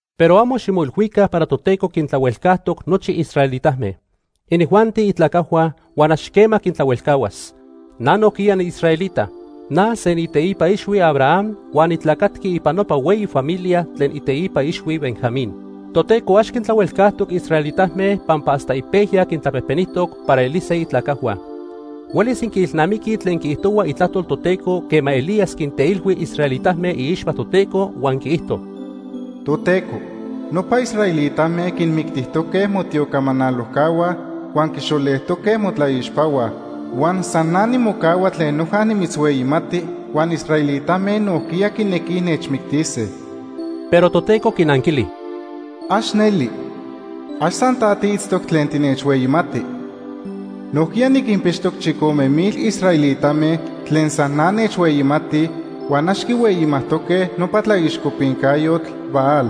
Pero amo ximoilhuica para Toteco quintlahuelcajtoc nochi israelitame. Inijuanti itlacajhua, huan ax quema quintlahuelcahuas. Na nojquiya niisraelita. Na se niiteipa ixhui Abraham huan nitlacatqui ipan nopa hueyi familia tlen iteipa ixhui Benjamín. Toteco ax quintlahuelcajtoc israelitame pampa hasta ipejya quintlapejpenijtoc para elise itlacajhua. Huelis inquiilnamiquij tlen quiijtohua Itlajtol Toteco quema Elías quinteilhui israelitame iixpa Toteco, huan quiijto: “Toteco, nopa israelitame quinmictijtoque motiocamanalojcahua huan quixolejtoque motlaixpahua. Huan san na nimocahua tlen noja nimitzhueyimati huan israelitame nojquiya quinequij nechmictise.” Pero Toteco quinanquili: “¡Ax neli! Ax san ta tiitztoc tlen tinechhueyimati. Nojquiya niquinpixtoc chicome mil israelitame tlen san na nechhueyimatij huan ax quihueyimajtoque nopa tlaixcopincayotl Baal.”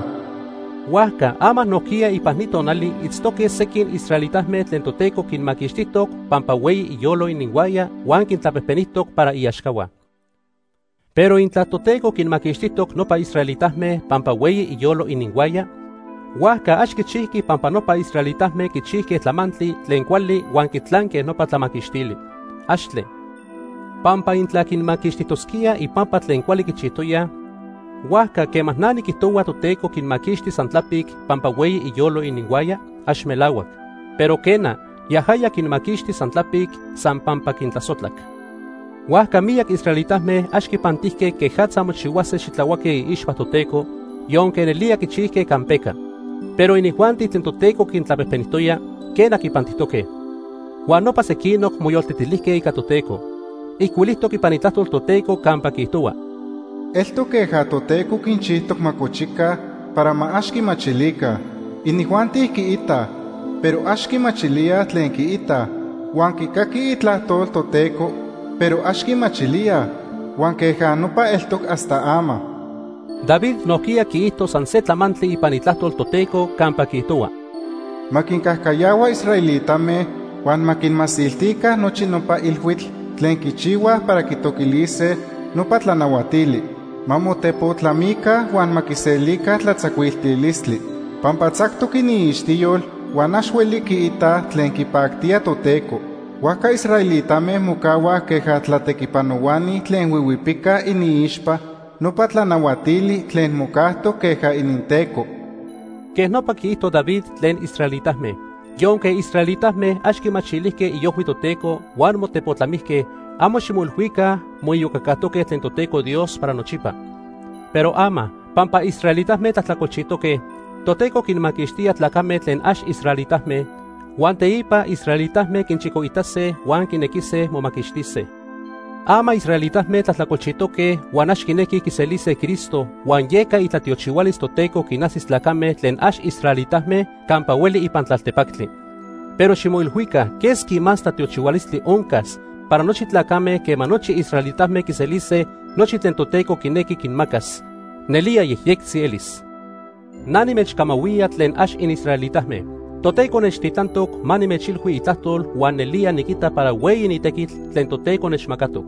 Huajca ama nojquiya ipan ni tonali itztoque sequin israelitame tlen Toteco quinmaquixtijtoc pampa hueyi iyolo ininhuaya huan quintlapejpenijtoc para iaxcahua. Pero intla Toteco quinmaquixtijtoc nopa israelitame pampa hueyi iyolo ininhuaya, huajca ax quichijqui pampa nopa israelitame quichijque tlamantli tlen cuali huan quitlanque nopa tlamaquixtili. ¡Axtle! Pampa intla quinmaquixtijtosquía ipampa tlen cuali quichijtoya, huajca quema na niquijtohua Toteco quinmaquixti san tlapic pampa hueyi iyolo ininhuaya, ax melahuac. Pero quena, yajaya quinmaquixti san tlapic, san pampa quintlasojtlac. Huajca miyac israelitame ax quipantijque quejatza mochihuase xitlahuaque iixpa Toteco, yonque nelía quichijque campeca. Pero inijuanti tlen Toteco quintlapejpenijtoya, quena, quipantijtoque. Huan nopa sequinoc moyoltetilijque ica Toteco. Ijcuilijtoc ipan Itlajtol Toteco campa quiijtohua: “Eltoc queja Toteco quinchijtoc ma cochica para ma ax quimachilica. Inijuanti quiitaj, pero ax quimachilíaj tlen quiitaj, huan quicaquij Itlajtol Toteco, pero ax quimachilíaj, huan queja nopa eltoc hasta ama.” David nojquiya quiijto san se tlamantli ipan Itlajtol Toteco campa quiijtohua: “Ma quincajcayahua israelitame huan ma quinmasiltica nochi nopa ilhuitl tlen quichihuaj para quitoquilise nopa tlanahuatili. Ma motepotlamica huan ma quiselica tlatzacuiltilistli. Pampa tzactoc iniixtiyol huan ax hueli quiitaj tlen quipactía Toteco. Huajca israelitame mocahuaj queja tlatequipanohuani tlen huihuipicaj iniixpa nopa tlanahuatili tlen mocajtoc queja ininteco.” Quej nopa quiijto David tlen israelitame. Yonque israelitame ax quimachilijque iojhui Toteco huan motepotlamijque, amo ximoilhuica moiyocacajtoque tlen Toteco Dios para nochipa. Pero ama, pampa israelitame tlajtlacolchijtoque, Toteco quinmaquixtía tlacame tlen ax israelitame. Huan teipa israelitame quinchicoitase huan quinequise momaquixtise. Ama israelitame tlajtlacolchijque huan ax quinequij quiselise Cristo huan yeca itlatiochihualis Toteco quinajsic tlacame tlen ax israelitame campa hueli ipan tlaltepactli. Pero ximoilhuica quesqui más tlatiochihualistli oncas para nochi tlacame quema nochi israelitame quiselise nochi tlen Toteco quinequi quinmacas. Nelía yejyectzi elis. Na nimechcamahuía tlen ax inisraelitame. Toteco nechtitlantoc ma nimechilhui Itlajtol huan nelía niquita para hueyi ni tequitl tlen Toteco nechmacatoc.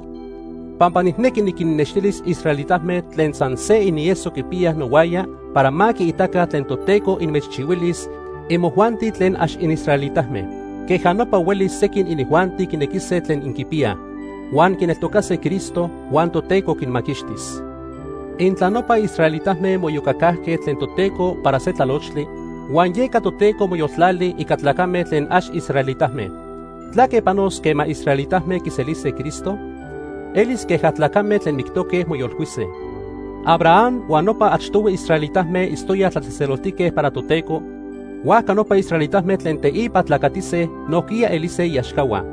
Pampa nijnequi niquinnextilis israelitame tlen san se inieso quipiyaj nohuaya para ma quiitaca tlen Toteco inmechchihuilis imojuanti tlen ax inisraelitame. Queja nopa huelis sequin inijuanti quinequise tlen inquipiyaj, huan quineltocase Cristo, huan Toteco quinmaquixtis. Intla nopa israelitame moiyocacajque tlen Toteco para se tlalochtli, huan yeca Toteco moyoltlali ica tlacame tlen ax israelitame, ¿tlaque panos quema israelitame quiselise Cristo? Elis queja tlacame tlen mictoque moyolcuise. Abraham huan nopa achtohui israelitame itztoyaj tlatzejtzeloltique para Toteco, huajca nopa israelitame tlen teipa tlacatise nojquiya elise iaxcahua.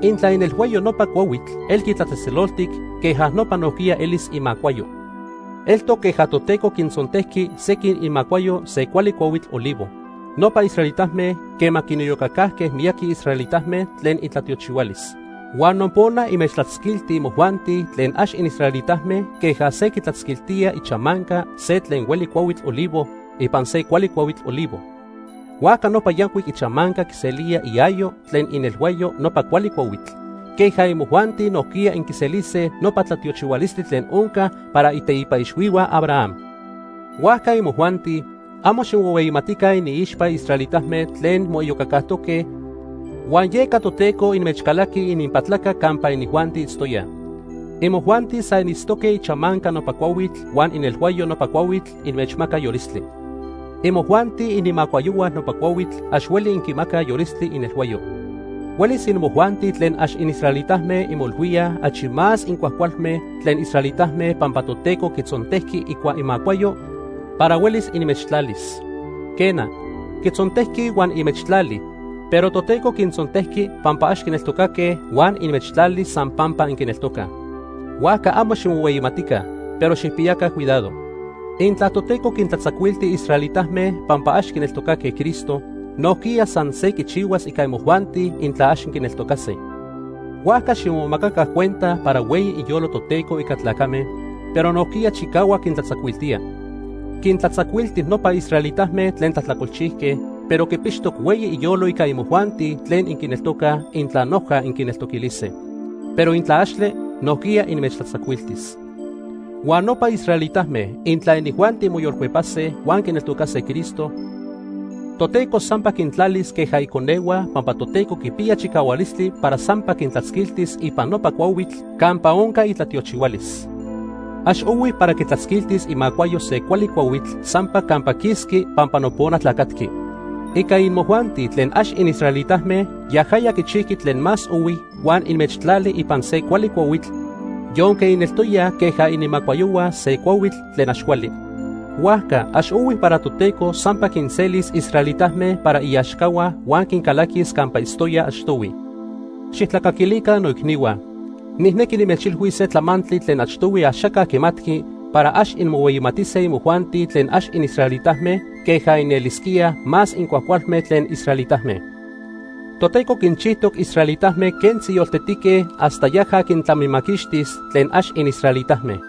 Intla inelhuayo nopa cuahuitl elqui tlatzejtzeloltic, queja nopa nojquiya elis imacuayo. Eltoc queja Toteco quintzontejqui sequin imacuayo se cuali cuahuitl olivo, nopa israelitame, quema quiniyocacajque miyaqui israelitame tlen itlatiochihualis. Huan nopona inmechtlatzquilti imojuanti tlen ax inisraelitame queja se quitlatzquiltía ichamanca se tlen hueli cuahuitl olivo ipan se cuali cuahuitl olivo. Huajca nopa yancuic ichamanca quiselía iayo tlen inelhuayo nopa cuali cuahuitl, queja imojuanti nojquiya inquiselise nopa tlatiochihualistli tlen onca para iteipa ixhuihua Abraham. Huajca imojuanti, amo ximohueyimatica iniixpa israelitame tlen moiyocacajtoque huan yeca Toteco inmechcalaqui ininpatlaca campa inijuanti itztoyaj. Imojuanti san initztoque ichamanca nopa cuahuitl huan inelhuayo nopa cuahuitl inmechmaca yolistli. Imojuanti inimacuayohua nopa cuahuitl ax hueli inquimacaj yolistli inelhuayo. Huelis imojuanti tlen ax inisraelitame inmoilhuíaj achi más incuajcualme tlen israelitame pampa Toteco quitzontejqui icua imacuayo para huelis inmechtlalis. Quena, quintzontejqui huan inmechtlali, pero Toteco quintzontejqui pampa ax quineltocaque huan inmechtlali san pampa inquineltocaj. Huajca amo ximohueyimatica, pero xijpiyaca cuidado. Intla Toteco quintlatzacuilti israelitame pampa ax quineltocaque Cristo, nojquiya san se quichihuas ica imojuanti intla ax inquineltocase. Huajca ximomacaca cuenta para hueyi iyolo Toteco ica tlacame, pero nojquiya chicahuac quintlatzacuiltía. Quintlatzacuilti nopa israelitame tlen tlajtlacolchijque, pero quipixtoc hueyi iyolo ica imojuanti tlen inquineltocaj intla noja inquineltoquilise. Pero intla axtle, nojquiya inmechtlatzacuiltis. Huan nopa israelitame, intla inijuanti moyolcuepase huan quineltocase Cristo, Toteco sampa quintlalis queja iconehua pampa Toteco quipiya chicahualistli para sampa quintlatzquiltis ipan nopa cuahuitl campa onca itlatiochihualis. Ax ohui para quitlatzquiltis imacuayo se cuali cuahuitl sampa campa quisqui pampa nopona tlacatqui. Ica imojuanti tlen ax inisraelitame, yajaya quichijqui tlen más ohui huan inmechtlali ipan se cuali cuahuitl yonque ineltoyaj queja inimacuayohua se cuahuitl tlen ax cuali. Huajca ax ohui para Toteco sampa quinselis israelitame para iaxcahua huan quincalaquis campa itztoyaj achtohui. Xijtlacaquilica noicnihua, nijnequi nimechilhuis se tlamantli tlen achtohui axaca quimatqui para ax inmohueyimatise imojuanti tlen ax inisraelitame queja inelisquíaj más incuajcualme tlen israelitame. Toteco quinchijtoc israelitame quentzi yoltetique hasta yaja quintlamimaquixtis tlen ax inisraelitame.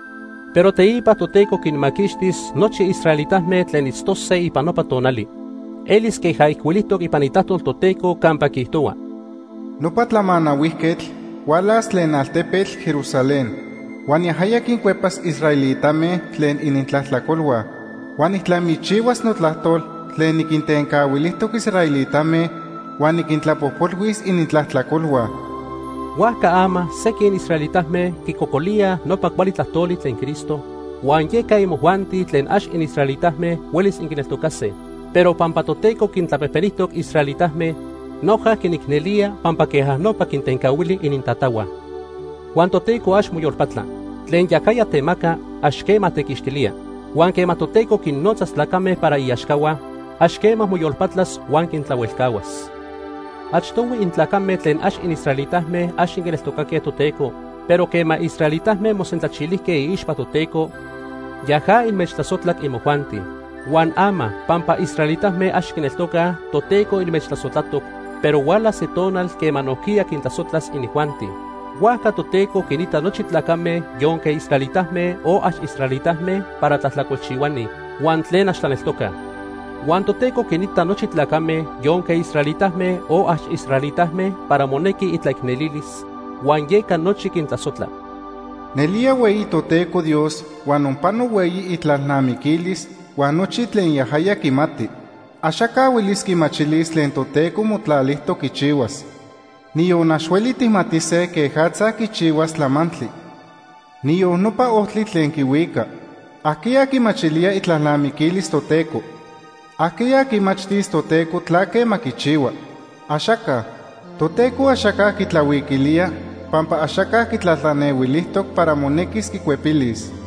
Pero teipa Toteco quinmaquixtis nochi israelitame tlen itztose ipan nopa tonali. Elis queja ijcuilijtoc ipan Itlajtol Toteco campa quiijtohua: “Nopa Tlamanahuijquetl hualas tlen altepetl Jerusalén. Huan yajaya quincuepas israelitame tlen inintlajtlacolhua. Huan nijtlamichihuas notlajtol tlen niquintencahuilijtoc israelitame huan niquintlapojpolhuis inintlajtlacolhua.” Huajca ama sequin israelitame quicocolíaj nopa cuali tlajtoli tlen Cristo, huan yeca imojuanti tlen ax inisraelitame huelis inquineltocase. Pero pampa Toteco quintlapejpenijtoc israelitame, noja quinicnelía pampa queja nopa quintencahuili inintatahua. Huan Toteco ax moyolpatla. Tlen yajaya temaca, ax quema tequixtilía. Huan quema Toteco quinnotzas tlacame para iaxcahua, ax quema moyolpatlas huan quintlahuelcahuas. Achtohui intlacame tlen ax inisraelitame ax inquineltocaque Toteco, pero quema israelitame mosentlanchijque iixpa Toteco, yaja inmechtlasojtlac imojuanti. Huan ama pampa israelitame ax quineltocaj, Toteco inmechtlasojtlatoc, pero hualas se tonal quema nojquiya quintlasojtlas inijuanti. Huajca Toteco quinita nochi tlacame yonque israelitame o ax israelitame para tlajtlacolchihuani, huan tlen ax tlaneltocaj. Huan Toteco quinita nochi tlacame, yonque israelitame o ax israelitame, para monequi itlaicnelilis, huan yeca nochi quintlasojtla. ¡Nelía hueyi Toteco Dios huan onpano hueyi itlalnamiquilis huan nochi tlen yajaya quimati! Axaca huelis quimachilis tlen Toteco motlalijtoc quichihuas. Niyon ax hueli tijmatise quejatza quichihuas tlamantli, niyon nopa ojtli tlen quihuica. ¿Ajqueya quimachilía itlalnamiquilis Toteco? ¿Ajqueya quimachtis Toteco tlaque ma quichihua? ¡Axaca! Toteco axaca quitlahuiquilía pampa axaca quitlatlanehuilijtoc para monequis quicuepilis.